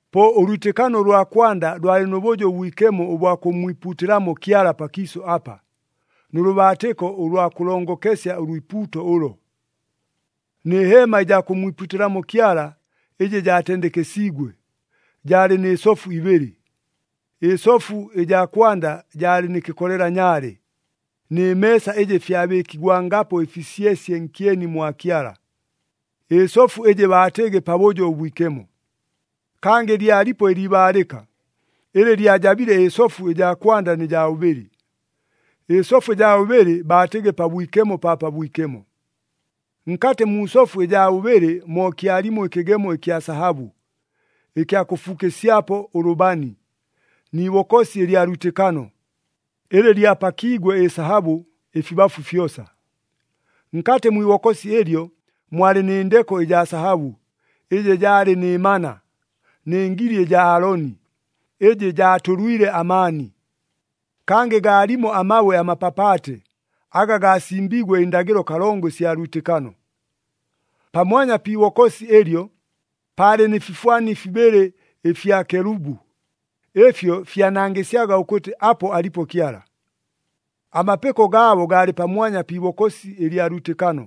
Po ʉlwitɨkano ʉlwa kwanda lwalɨ nʉ bʉjo ʉbwikemo ʉbwa kʉmmwipuutɨlamo Kyala pakiisʉ apa, nʉ lʉbaatɨko ʉlwa kʉlongokesya ʉlwipuuto ʉlo. Nɨ heema ɨjaa kʉmmwipuutɨlamo Kyala ɨjɨ jaatendekesiigwe, jaalɨ nɨ sofu ibɨlɨ. Ɨsofu ɨjaa kwanda jaalɨ nɨ kɨkolela nyaale, nɨ meesa ɨjɨ fyabɨɨkigwangapo ɨfisyesye nkyeni mwa Kyala. Ɨsofu ɨjɨ baatɨgɨ Pabʉjo ʉBwikemo. Kangɨ lyalipo ɨliibaalɨka, ɨlɨ lyajabile ɨsofu ɨjaa kwanda nɨ jaa bʉbɨlɨ. Ɨsofu ɨjaa bʉbɨlɨ baatɨgɨ Pabwikemo pa Pabwikemo. Nkatɨ mu sofu ɨjaa bʉbɨlɨ mo kyalimo ɨkɨgemo ɨkya sahabʉ, ɨkya kʉfuukɨsyapo ʉlʉbani, ni ibokosi ɨlya lwitɨkano, ɨlɨ lyapakiigwe ɨsahabʉ ɨfibafu fyosa. Nkatɨ mwi ibokosi ɨlyo, mwalɨ nɨ ndeko ɨjaa sahabʉ, ɨjɨ jaalɨ nɨ mana, nɨ ngili ɨjaa Aaloni, ɨjɨ jaatʉlwile amaani. Kangɨ gaalimo amabwe amapapaate, aga gaasimbiigwe ɨndagɨlo kalongo ɨsya lwitɨkano. Pamwanya pi ibokosi ɨlyo, paalɨ nɨ fifwani fibɨlɨ ɨfya kelubu, ɨfyo fyanangɨsyaga ʉkʉtɨ apo alipo Kyala. Amapɨko gaabo gaalɨ pamwanya pi ibokosi ɨlya lwitɨkano,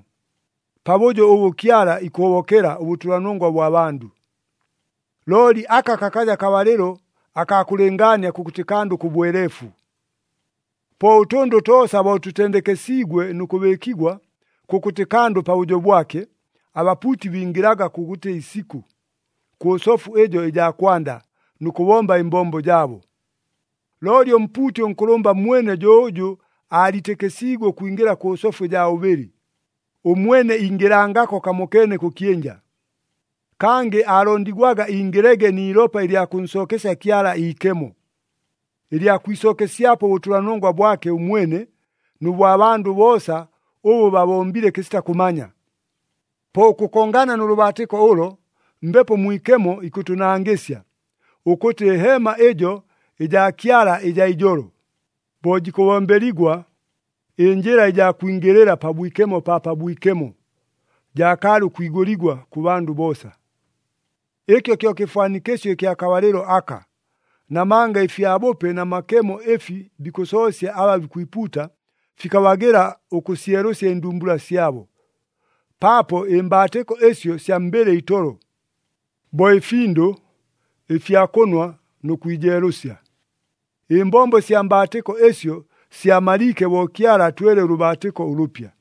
pabʉjo ʉbʉ Kyala ikʉhobokela ʉbʉtʉlanongwa bwa bandʉ. Looli aka kakaja kabalɨlo akaa kʉlɨngaania kʉkʉtɨ kandʉ kʉ bweleefu. Po ʉtʉndʉ toosa bo tʉtendekesiigwe nʉ kʉbɨɨkigwa, kʉkʉtɨ kandʉ pabʉjo bwake, abapuuti bingɨlaga kʉkʉtɨ isikʉ, kʉ sofu ɨjo ɨjaa kwanda, nʉ kʉbomba ɨmbombo jaabo. Looli ʉmpuuti ʉnkʉlʉmba mwene jo ʉjʉ aaliitɨkɨsiigwe ʉkwingɨla kʉ sofu ɨjaa bʉbɨlɨ, ʉmwene ingɨlangako kamokeene kʉ kyɨnja. Kangɨ aalondigwaga ingɨlege ni ilopa ɨlya kʉnsookesya Kyala iikemo, ɨlya kwisookesyapo ʉbʉtʉlanongwa bwake ʉmwene, nʉ bwa bandʉ boosa ʉbʉ babombile kɨsita kʉmanya. Po ʉkʉkongana nʉ lʉbaatɨko ʉlo, Mbepo Mwikemo ikʉtʉnangɨsya, ʉkʉtɨ ɨheema ɨjo ɨjaa Kyala ɨjaa ijolo, bo jikʉbombeligwa, ɨnjɨla ɨjaa kwingɨlɨla Pabwikemo pa Pabwikemo jaakaalɨ ʉkwigʉligwa kʉ bandʉ boosa. Ɨkyo kyo kɨfwanikɨsyo ɨkya kabalɨlo aka, namanga ɨfyabʉpe na makemo ɨfi bikʉsoosya aba bikwipuuta, fikabagɨla ʉkʉsyelʉsya ɨndumbula syabo. Paapo ɨmbaatɨko ɨsyo sya mbɨlɨ itolo, bo ɨfindʉ, ɨfya kʉnwa, nʉ kwijeelʉsya. Ɨmbombo sya mbaatɨko ɨsyo syamaliike bo Kyala atwele ʉlʉbaatɨko ʉlʉpya.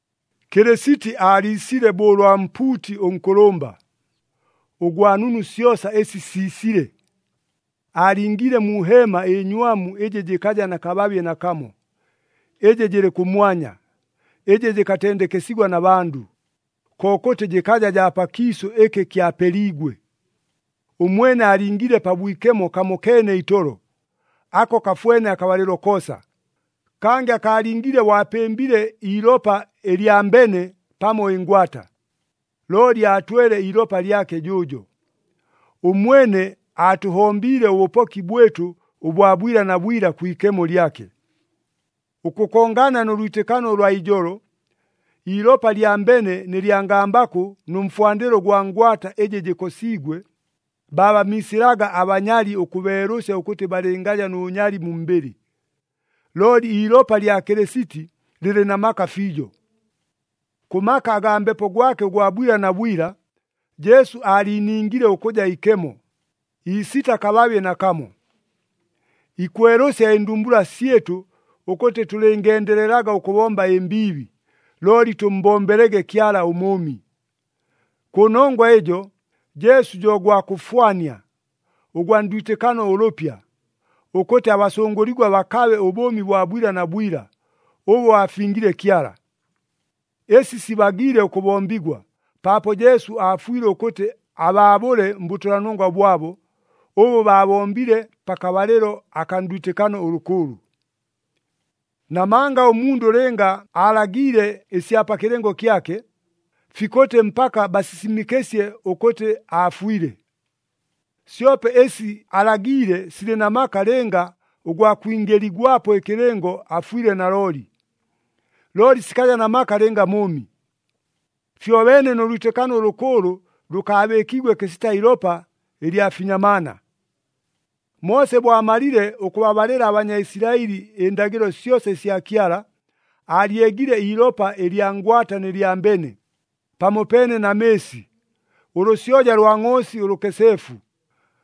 Kɨlɨsiti aaliisile bo ʉlwa mpuuti ʉnkʉlʉmba, ʉgwa nunu syosa ɨsi siisile. Aalingiile mu heema ɨnywamu ɨjɨ jɨkaja na kababye nakamo, ɨjɨ jɨlɨ kʉmwanya, ɨjɨ jɨkatendekesigwa na bandʉ, kokʉtɨ jɨkaja jaa pakiisʉ ɨkɨ kyapeliigwe. Ʉmwene aalingiile Pabwikemo kamokeene itolo, ako kafwene akabalɨlo koosa. Kangɨ akaalingiile bo apɨmbile iilopa ɨlya mbene pamo ɨngwata, looli aatwele iilopa lyake jʉʉjo. Ʉmwene aatʉhombiile ʉbʉpoki bwɨtʉ ʉbwa bwila na bwila kwi ikemo lyake. Ʉkʉkongana nʉ lwitɨkano ʉlwa ijolo, iilopa lya mbene nɨ lya ngambakʉ nʉ mfwandɨlo ʉgwa ngwata ɨjɨ jɨkosiigwe, baabamiisɨlaga abanyali ʉkʉbeelʉsya ʉkʉtɨ balɨngaja nʉ bʉnyali mu mbɨlɨ. Looli iilopa lya Kɨlɨsiti lɨlɨ na maka fiijo! Kʉ maka agaa Mbepo gwake ʉgwa bwila na bwila, Jesu aaliiningile ʉkʉja ikemo, iisita kababye nakamo. Ikwelʉsya ɨndumbula syɨtʉ ʉkʉtɨ tʉlɨngendelelaga ʉkʉbomba ɨmbiibi, looli tʉmmbombelege Kyala ʉMʉʉmi. Kʉnongwa ɨjo, Jesu jo gwa kʉfwania, ʉgwa ndwitɨkano ʉlʉpya, ʉkʉtɨ abasʉngʉligwa bakabe ʉbʉʉmi bwa bwila na bwila, ʉbʉ aafingile Kyala. Ɨsi sibagiile ʉkʉbombigwa, paapo Jesu aafwile ʉkʉtɨ abaabʉle mbʉtʉlanongwa bwabo, ʉbʉ baabombile pakabalɨlo akaa ndwitɨkano ʉlʉkʉʉlʉ. Namanga ʉmundʉ lɨnga aalagiile ɨsya pa kɨlɨngo kyake, fikʉtɨ mpaka basisimɨkɨsye ʉkʉtɨ aafwile. Syope ɨsi alagiile silɨ na maka lɨnga ʉgwa kwingɨligwapo ɨkɨlɨngo afwile nalooli. Looli sikaja na maka lɨnga mʉʉmi. Fyobeene nʉ lwitɨkano ʉlʉkʉʉlʉ lʉkaabɨɨkiigwe kɨsita ilopa ɨlya finyamaana. Moose bo amalile ʉkʉbabalɨla aBanyaisilaɨli ɨndagɨlo syosa ɨsya Kyala, aalyegile iilopa ɨlya ngwata nɨ lya mbene, pamopeene na mɨɨsi, ʉlʉsyoja lwa ngʼoosi ʉlʉkeseefu,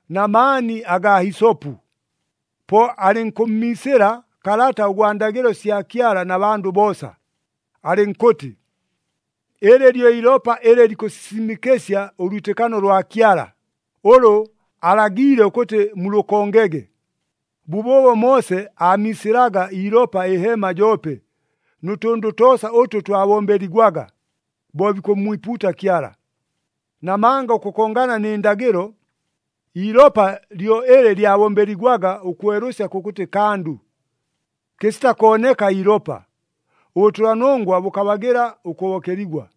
na maani agaa hisopu. Po alɨnkʉmmiisɨla kalata ʉgwa ndagɨlo sya Kyala na bandʉ boosa, alɨnkʉtɨ, “Ɨlɨ lyo ilopa ɨlɨ likʉsisimɨkɨsya ʉlwitɨkano lwa Kyala, ʉlʉ alagiile ʉkʉtɨ mulʉkongege.” Bʉbʉʉbo Moose aamiisɨlaga iilopa ɨheema joope, nʉ tʉndʉ toosa ʉtʉ twabombeligwaga, bo bikʉmmwipuuta Kyala. Namanga ʉkʉkongana nɨ ndagɨlo, iilopa lyo ɨlɨ lyabombeligwaga ʉkwelʉsya kʉkʉtɨ kandʉ. Kɨsita kooneka iilopa, ʉbʉtʉlanongwa bʉkabagɨla ʉkʉhobokeligwa.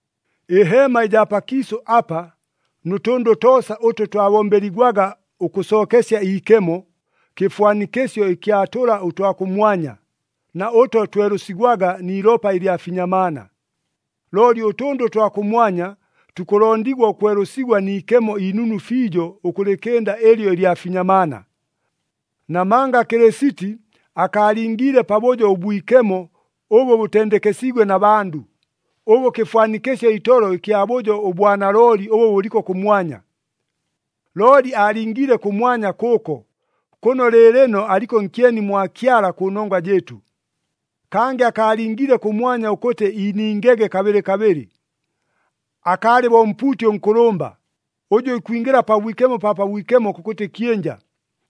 Ɨheema ɨjaa pakiisʉ apa nʉ tʉndʉ toosa ʉtʉ twabombeligwaga ʉkʉsookesya iikemo, kɨfwanikɨsyo ɨkya tʉla ʉtwa kʉmwanya, na ʉto twelʉsigwaga ni ilopa ɨlya finyamaana. Looli ʉtʉndʉ ʉtwa kʉmwanya, tukʉlondigwa ʉkwelʉsigwa ni ikemo inunu fiijo ʉkʉlɨkɨnda ɨlyo ɨlya finyamaana. Namanga Kɨlɨsiti akaalingiile Pabʉjo ʉBwikemo ʉbʉ bʉtendekesiigwe na bandʉ, ʉbʉ kɨfwanikɨsyo itolo ɨkya bʉjo ʉbwa nalooli ʉbʉ bʉliko kʉmwanya. Looli aalingiile kʉmwanya kʉʉko, kʉno lɨɨlɨno aliko nkyeni mwa Kyala kʉnongwa jɨɨtʉ. Kangɨ akaalingiile kʉmwanya ʉkʉtɨ iiningege kabɨlɨ kabɨlɨ. Akaalɨ bo ʉmpuuti ʉnkʉlʉmba, ʉjʉ ikwingɨla Pabwikemo pa Pabwikemo kʉkʉtɨ kyɨnja,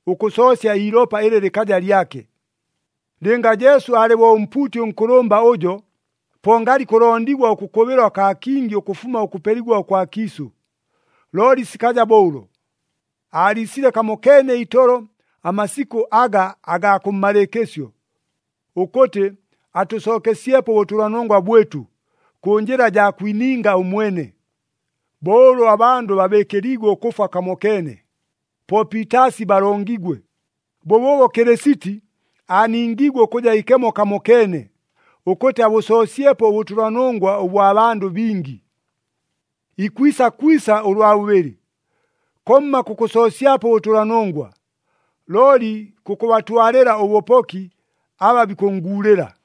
ʉkʉsoosya iilopa ɨlɨ lɨkaja lyake. Lɨnga Jesu alɨ bo ʉmpuuti ʉnkʉlʉmba ʉjo, po ngalɨ ikʉlondigwa ʉkʉkʉbɨlwa kaa kingi ʉkʉfuma ʉkʉpeligwa ʉkwa kiisʉ. Looli sikaja bo ʉlo! Aaliisile kamokeene itolo amasikʉ aga agaa kʉmmalɨɨkɨsyo, ʉkʉtɨ atʉsookesyepo ʉbʉtʉlanongwa bwɨtʉ, kʉ njɨla jaa kwininga ʉmwene. Bo ʉlʉ abandʉ babɨɨkɨliigwe ʉkʉfwa kamokeene, po piitaasi balongigwe, bʉbʉʉbo Kɨlɨsiti aaningiigwe ʉkʉja ikemo kamokeene, ʉkʉtɨ abʉsoosyepo ʉbʉtʉlanongwa ʉbwa bandʉ bingi. Ikwisa kwisa ʉlwa bʉbɨlɨ, komma kʉkʉsoosyapo ʉbʉtʉlanongwa, looli kʉkʉbatwalɨla ʉbʉpoki aba bikʉnnguulɨla.